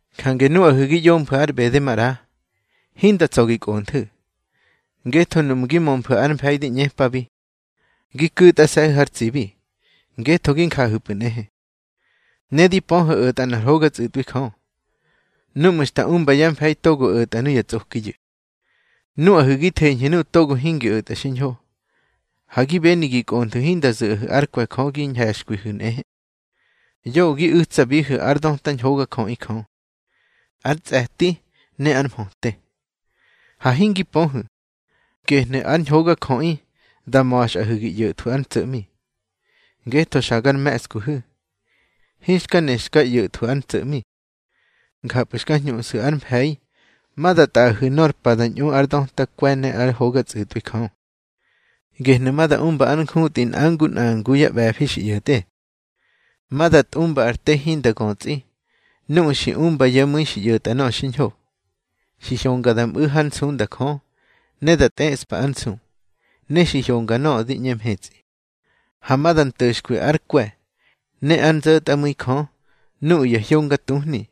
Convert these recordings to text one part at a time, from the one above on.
Jange nuꞌahu̱ gi ꞌyomfu̱ ár ꞌbede maꞌra, hinda tsa̱ gi kꞌonthu̱. Ngetho nuꞌmu̱ gi mömfu̱ ár mfe̱i di ꞌñepabi, gi ku̱tꞌase̱hu̱ har tsibi, ngetho gi njahu̱pꞌu̱ nꞌehe. Ne di pöhu̱ o̱tꞌa nꞌar hoga tsꞌu̱tꞌwi Jö, núꞌmu̱ xta umba yá mfe̱i togo o̱tꞌa nuya tsꞌokiyu̱. Nuꞌahu̱ gi theñhu̱ nuꞌu̱ togo hingi o̱tꞌa xiñho, ha gi beni gi kꞌonthu̱ hinda zu̱ꞌahu̱ ár kwe̱ Jö gi ñhe̱xkwihu̱ nꞌehe. Yoꞌö gi u̱tsabihu̱ ár döta ñhogajöꞌi Jö, ár tsꞌe̱ti, ne ár mhöte. Ha hingi pöhu̱, gehnu̱ ár ñhogajöꞌi da ma̱xꞌahu̱ gi ꞌyo̱thwu̱ ár ntso̱ꞌmi. Ngetho xa gar me̱ꞌskuhu̱, hinxka ne xka ꞌyo̱thwu̱ ár ntso̱ꞌmi. Njapꞌu̱ xka hñuꞌsu̱ ár mfe̱i ma da tꞌaꞌahu̱ nor pa da ñꞌu ár döta kwe̱ ne ár hoga tsꞌu̱tꞌwi Jö. Gehnu̱ ma da umba ár njutꞌi nꞌa ngu nꞌa ngu yá ꞌbe̱fi xi ꞌyo̱tꞌe. Ma da tꞌumba ar te hinda götsꞌi nuꞌu̱ xi umba yá mu̱i xi ꞌyo̱tꞌa nöꞌö xiñho, xi hyonga da mꞌu̱ hár nsunda Jö, ne da tꞌeꞌspa ár nsu, ne xi hyonga nöꞌö di ꞌñe mhetsꞌi. Ha ma da nto̱xkwi ár kwe̱ ne ár nzo̱tꞌamu̱i Jö nuꞌu̱ ya hyonga tuhni,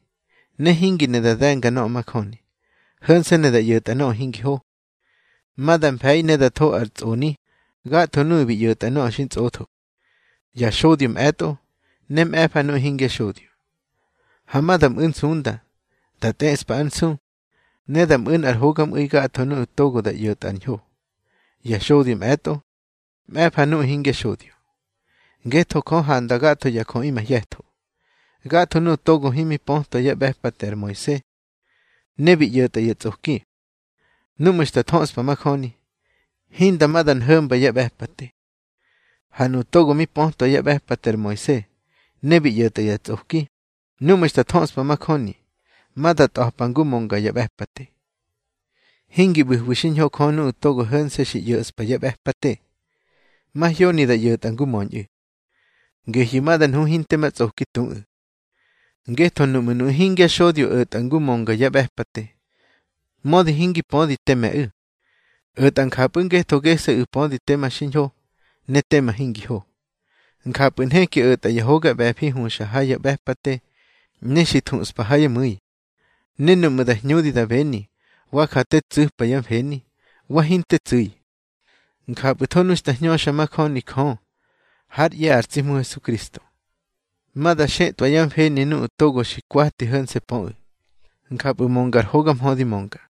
ne hingi ne da de̱nga nöꞌö majöni. Ho̱nse̱ ne da ꞌyo̱tꞌa nöꞌö hingi ho. Ma da mfe̱i ne da tho ar tsꞌoni gatho nuꞌu̱ bi ꞌyo̱tꞌa nöꞌö xi ntsꞌotho, ya xodyo mꞌe̱tꞌo, ne mꞌe̱fa nuꞌu̱ hingya xodyo. Ha ma da mꞌu̱ nsunda, da tꞌeꞌspa ár nsu, ne da mꞌu̱ nꞌar hogamꞌu̱i gatho nuꞌu̱ togo da ꞌyo̱tꞌa ar ñho, ya xodyo mꞌe̱tꞌo, mꞌe̱fa nuꞌu̱ hingya xodyo. Ngetho Jö handa gatho ya jöꞌi mahye̱tho. Gatho nuꞌu̱ togo himi pötwa yá ꞌbe̱pate ar Moise, ne bi ꞌyo̱tꞌa ya tsꞌoki, núꞌmu̱ xta thöꞌspa majöni, hinda ma nda nho̱mba ya ꞌbe̱pate. Ha nuꞌu̱ togo mi pötwa yá ꞌbe̱pate ar Moise, ne bi ꞌyo̱tꞌa ya tsꞌoki, núꞌmu̱ xta thöꞌspa majöni, ma da tꞌa̱pa ngu mönga ya ꞌbe̱pate. Hingi ꞌbu̱hwi xiñho Jö nuꞌu̱ togo ho̱nse̱ xi ꞌyo̱ꞌspa ya ꞌbe̱pate, mahyoni da ꞌyo̱tꞌa ngu möñꞌu̱. Gehyu̱ ma da nhu hinte ma tsꞌoki tuꞌu̱. Ngetho nuꞌmu̱ nuꞌu̱ hingya xodyo o̱tꞌa ngu mönga ya ꞌbe̱pate, mödi hingi pödi teme̱ꞌu̱, o̱tꞌa njapꞌu̱ ngetho gese̱ꞌu̱ pödi tema xiñho ne tema hingi ho. Njapꞌu̱ nheki o̱tꞌa ya hoga ꞌbe̱fi huxa ha ya ꞌbe̱pate ne xi thuꞌspa ha yá mu̱i, ne nuꞌmu̱ da hñudi da beni wa ja te tsu̱pa yá mfeni, wa hinte tsu̱i. Njapꞌu̱tho nu xta hñöxa majöni Jö hár ꞌye̱ ar tsi Hmu Hesukristo, ma da xetꞌwa yá mfeni nuꞌu̱ togo xi kwati ho̱nse̱ pöꞌu̱. Njapꞌu̱ mönga ar hoga mhö di mönga.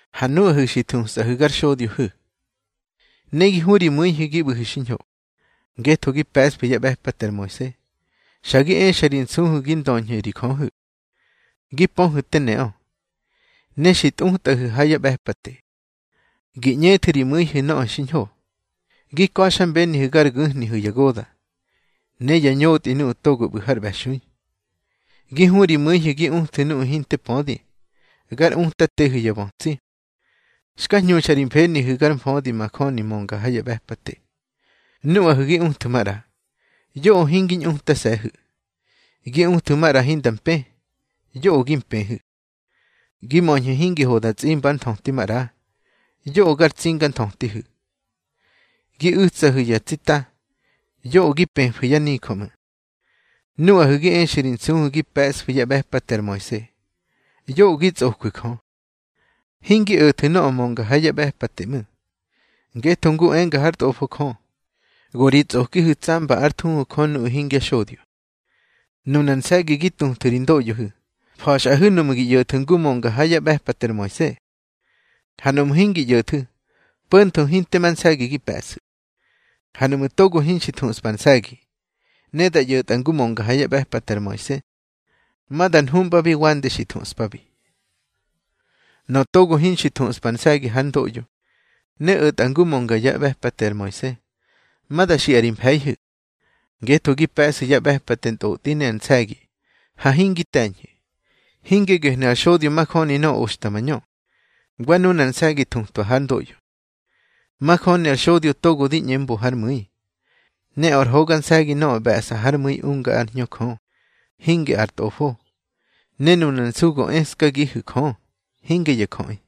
Ha nuꞌahu̱, xi thusꞌahu̱ gar xodyohu̱, ne gi hu ri mu̱ihu̱ gi ꞌbu̱hu̱ xiñho, ngetho gi pe̱ꞌsfu̱ yá ꞌbe̱pate ar Moise. Xa gi exa ri nsuhu̱ gi ndöñhu̱ ri Jöhu̱. Gi pöhu̱ teme neꞌö, ne xi tꞌutꞌahu̱ ha ya ꞌbe̱pate, gi ꞌñethu̱ ri mu̱ihu̱ nöꞌö xiñho. Gi ka̱xmbenihu̱ gar gu̱hnihu̱ ya goda̱, ne yá ñotꞌi nuꞌu̱ togo ꞌbu̱ har ꞌbe̱xui. Gi hu ri mu̱ihu̱ gi uthu̱ nuꞌu̱ hinte pödi, gar utatehu̱ ya bötsi, xka hñuxa ri mfenihu̱ har mfödi majöni mönga ha ya ꞌbe̱pate. Nuꞌahu̱ gi uthu̱ maꞌra, yoꞌö hingi ñꞌutase̱hu̱. Gi uthu̱ maꞌra hinda mpë, yoꞌö gi mpëhu̱. Gi möñhu̱ hingi ho da tsꞌimba ár nthöti maꞌra, yoꞌö gar tsinganthötihu̱. Gi u̱tsahu̱ ya tsita, yoꞌö gi pëfu̱ yá nijö ꞌmu̱. Nuꞌahu̱ gi exu̱ ri nsuhu̱ gi pe̱ꞌsfu̱ yá ꞌbe̱pate ar Moise, yoꞌö gi tsꞌojwu̱ Jö, hingi o̱thu̱ nöꞌö mönga ha ya ꞌbe̱pate ꞌmu̱. Ngetho ngu enga hár tꞌofo Jö: Go ri tsꞌokihu̱ tsamba ár thuhu Jö nuꞌu̱ hingya xodyo. Nunar nse̱gi gi tuthu̱ ri ndoꞌyohu̱, fa̱xꞌahu̱ nuꞌmu̱ gi ꞌyo̱thu̱ ngu mönga ha yá ꞌbe̱pate ar Moise. Ha nuꞌmu̱ hingi ꞌyo̱thu̱, po̱ntho hinte ma nse̱gi gi pe̱ꞌsu̱. Ha nuꞌmu̱ togo hinxi thuꞌspa ar nse̱gi, ne da ꞌyo̱tꞌa ngu mönga ha yá ꞌbe̱pate ar Moise, ma da nhuꞌmbabi wande xi thuꞌspabi. Nöꞌö togo hinxi thuꞌspa ar nse̱gi hár ndoꞌyo ne o̱tꞌa ngu mönga yá ꞌbe̱pate ar Moise, ma da xiꞌa ri mfe̱ihu̱. Ngetho gi pe̱ꞌsu̱ ya ꞌbe̱pate ntꞌotꞌi ne ar nse̱gi, ha hingi te̱ñhu̱. Hinge gehnu̱ ar xodyo majöni nöꞌö oxta mañö, wa nunar nse̱gi thutwa hár ndoꞌyo. Majöni ar xodyo togo di ꞌñe mbo hár mu̱i. Ne ar hoga nse̱gi nöꞌö ꞌbe̱ꞌsa hár mu̱i unga ár Hñö Jö, hinge ar tꞌofo. Ne nunar nsu go eskagihu̱ Jö, hinge ya jöꞌi.